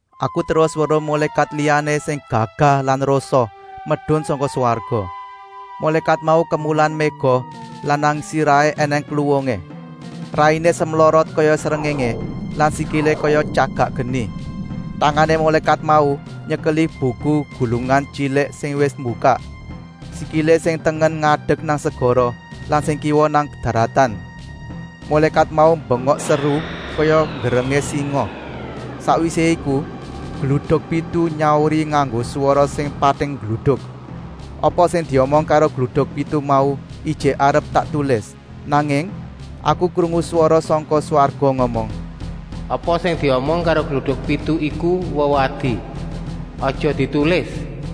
Aku terus weruh mulékat liyané sing gagah lan rosa medun sangka swarga. Mulékat mau kemulan méga lan nang sirahé ènèng kluwungé. Rainé semlorot kaya srengéngé lan sikilé kaya tyagak geni. Tangané mulékat mau nyekeli buku gulungan tyilik sing wis mbukak. Sikilé sing tengen ngadek nang segara lan sing kiwa nang daratan. Mulékat mau mbengok seru kaya nggerengé singa. Sakwisé iku gluduk pitu nyauri nganggo swara sing pating gluduk. Apa sing diomong karo gluduk pitu mau ijik arep tak tulis, nanging aku krungu swara sangka swarga ngomong: “Apa sing diomong karo gluduk pitu iku wewadi. Aja ditulis!”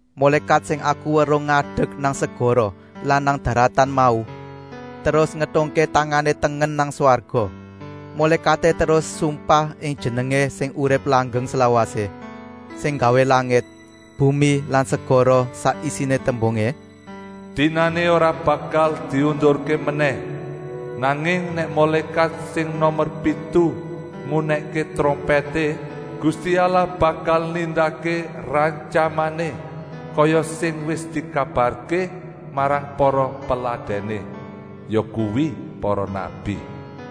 Mulékat sing aku weruh ngadek nang segara lan nang daratan mau terus ngetungké tangané tengen nang swarga. Mulékaté terus sumpah ing jenengé sing urip langgeng slawasé, sing nggawé langit, bumi lan segara sak isiné, tembungé: “Dinané ora bakal diundurké menèh. Nanging nèk mulékat sing nomer pitu ngunèkké trompèté, Gusti Allah bakal nindakké rantyamané, kaya sing wis dikabarké marang para peladèné, yakuwi para nabi.”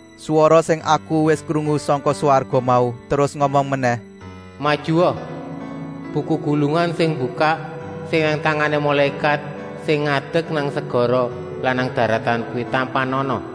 Swara sing aku wis krungu sangka swarga mau terus ngomong menèh: “Majua, buku gulungan sing mbukak sing nang tangané mulékat sing ngadek nang segara lan nang daratan kuwi tampanana.”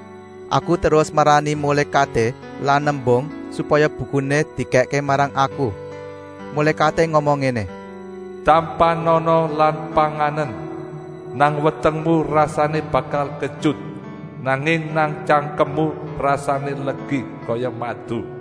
Aku terus marani mulékaté lan nembung, supaya bukuné dikèkké marang aku. Mulékaté ngomong ngéné: “Tampanana lan panganen. Nang wetengmu rasané bakal ketyut, nanging nang tyangkemmu rasané legi kaya madu.”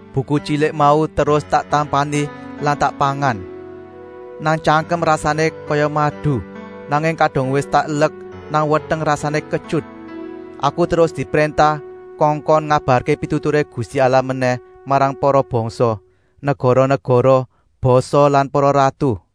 Buku tyilik mau terus tak tampani lan tak pangan. Nang tyangkem rasané kaya madu, nanging kadung wis tak elek nang weteng rasané ketyut. Aku terus dipréntah kongkon ngabarké pituturé Gusti Allah menèh marang para bangsa, negara-negara, basa lan para ratu.